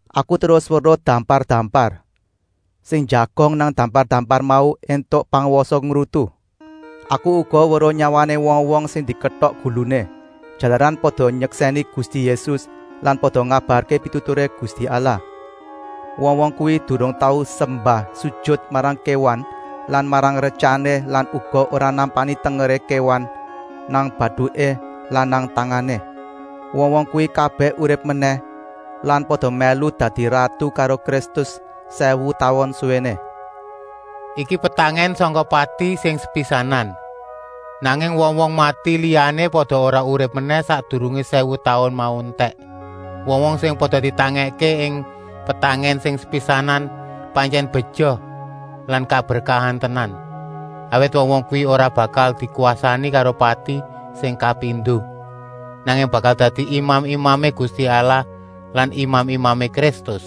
Aku terus weruh dampar-dampar. Sing njagong nang dampar-dampar mau éntuk pangwasa ngrutu. Aku uga weruh nyawané wong-wong sing diketok guluné, jalaran pada nyeksèni Gusti Yésus lan pada ngabarké pituturé Gusti Allah. Wong-wong kuwi durung tau sembah-sujut marang kéwan lan marang retyané lan uga ora nampani tengeré kéwan nang batuké lan nang tangané. Wong-wong kuwi kabèh urip menèh lan pada mèlu dadi ratu karo Kristus sèwu taun suwéné. Iki petangèn sangka pati sing sepisanan. Nanging wong-wong mati liyané pada ora urip menèh sakdurungé sèwu taun mau entèk. Wong-wong sing pada ditangèkké ing petangèn sing sepisanan pantyèn beja lan kaberkahan tenan. Awit wong-wong kuwi ora bakal dikwasani karo pati sing kapindo, nanging bakal dadi imam-imamé Gusti Allah lan imam-imamé Kristus.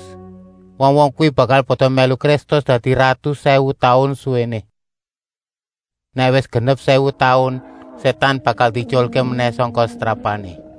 Wong-wong kuwi bakal pada mèlu Kristus dadi ratu sèwu taun suwéné. Nèk wis genep sèwu taun, Sétan bakal dietyulké menèh sangka setrapané.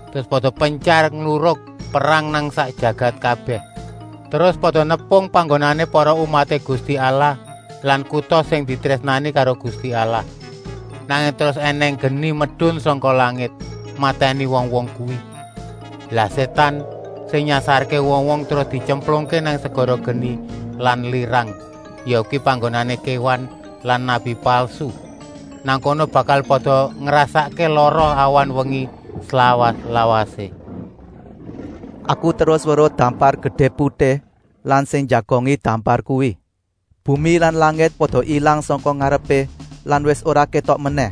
Terus pada pentyar ngluruk perang nang sak jagat kabèh, terus pada nepung panggonané para umaté Gusti Allah lan kuta sing ditrésnani karo Gusti Allah. Nanging terus ènèng geni medun sangka langit, matèni wong-wong kuwi. Lah Sétan, sing nyasarké wong-wong, terus dityemplungké nang segara geni lan lirang, yakuwi panggonané kéwan lan nabi palsu. Nang kono bakal pada ngrasakké lara awan-wengi, slawas-lawasé. Aku terus weruh dampar gedé putih lan sing njagongi dampar kuwi. Bumi lan langit pada ilang sangka ngarepé lan wis ora kétok menèh.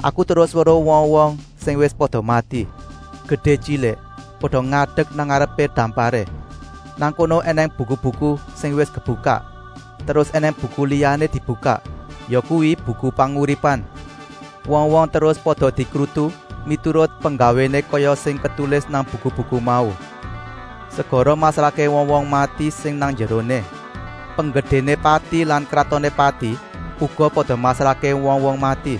Aku terus weruh wong-wong sing wis pada mati, gedé-tyilik, pada ngadek nang ngarepé damparé. Nang kono ènèng buku-buku sing wis kebukak, terus ènèng buku liyané dibukak, yakuwi Buku Panguripan. Wong-wong terus pada dikrutu miturut penggawéné kaya sing ketulis nang buku-buku mau. Segara masrahké wong-wong mati sing nang njeroné. Penggedéné Pati lan kratoné Pati uga pada masrahké wong-wong mati.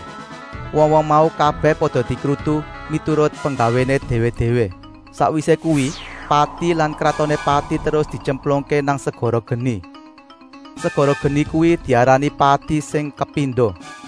Wong-wong mau kabèh pada dikrutu miturut penggawéné déwé-déwé. Sakwisé kuwi Pati lan kratoné Pati terus dityemplungké nang segara geni. Segara geni kuwi diarani pati sing kapindo.